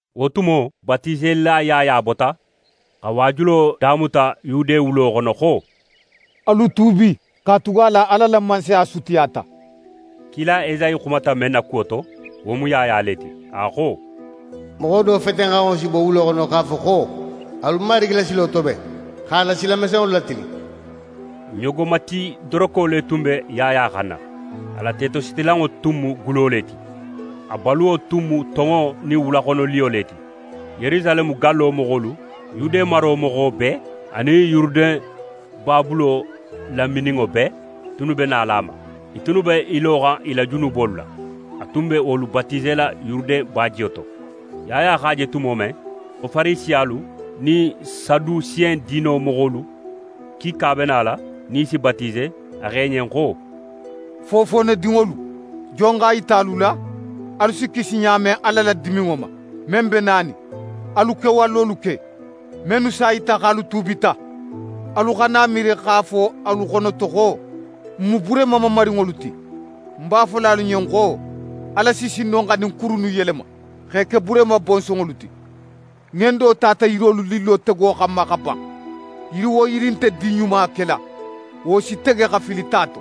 Wo tumo, Batiselila Yaya bota, xa waajulo damuta Yude wulo xono xo: «Alu tuubi; katugala Ala la Mansaya sutiyata.» Kila Esayi xumata men na kuwo to, wo mu Yaya le ti, a xo: «Moxo do fetenxanŋo si bo wulo xono x'a fo xo: Alu Marigi la silo toben, x'a la sila mesenŋolu latilin!» Ɲogomati doroko le tun be Yaya xanna, a la tetositilanŋo tun mu gulo le ti. A baluwo tun mu tonŋo nin wulaxonoliyo le ti. Yerusaleme gallo moxolu, Yude maro moxo bee anin Yuruden babulo lamininŋo bee tunnu be nala a ma. I tunnu b'e loxan i la junubolu la. A tun be wolu batisela Yuruden bajiyo to. Yaya x'a je tumo men xo Farisiyalu nin Sadusen diino moxolu kiika be nala nin i si batise, a xo i ɲen xo: «Fofoonedinŋolu! Jon x'a yita alu la, alu si kisi ɲa men Ala la diminŋo ma, men be nanin? Alu kewalolu ke mennu s'a yita xo alu tuubita. Alu xana i miiri x'a fo alu xono to xo: “N mu Burehima mamarinŋolu ti.” Ń b'a fola alu ɲen xo Ala si sin no xa ɲin kuru innu yelema x'e ke Burehima bonsonŋolu ti. Ŋendo tata yirolu lillo tego xanma xa ban. Yiri wo yiri nte din ɲuma kela, wo si tege xa fili ta to.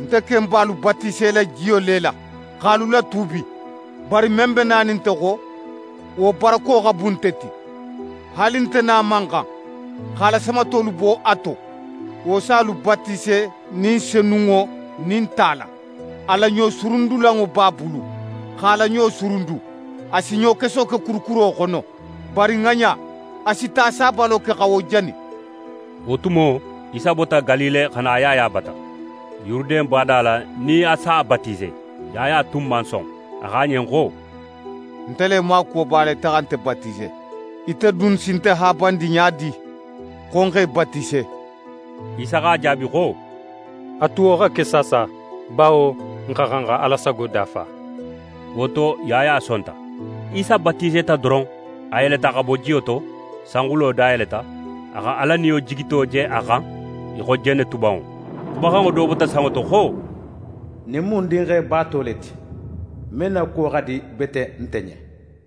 Nte ken be alu batisela jiyo le la x'alu latuubi. Bari men be nanin nte xo, wo barako xa bun nte ti. Haali nte nin a man xan xa a la samatolu bo a to. Wo si alu batise Ni Senunŋo nin ta la. A la ɲosurundulanŋo b'a bulu x'a la ɲo surundu. A si ɲokeso ke kurukuro xono, bari ŋaɲa, a si ta sabalo ke xa wo jani.» Wo tumo, Isa bota Galile xa na Yaya bata Yuruden bada la nin a s'a batise. Yaya tun man son. A xo a ɲen xo: «Nte le maakuwo b'a la ite xa nte batise, ite dun si nte haabandi ɲa di, xo ń x'é batise?» Isa x'a jaabi xo: «A tu wo xa ke saasa, bawo n xa xan xa Ala sago dafa.» Wo to, Yaya sonta. Isa batiseta doron, a yeleta xa bo jiyo to, sanxulo dayeleta, a xa Ala Niyo jigito je a xan í xo jenetubanŋo. Xumaxanŋo do bota sanŋo to xo: «Ɲin mu ń Dinxe baato le ti, men na kuwo xa di bete nte ɲen.»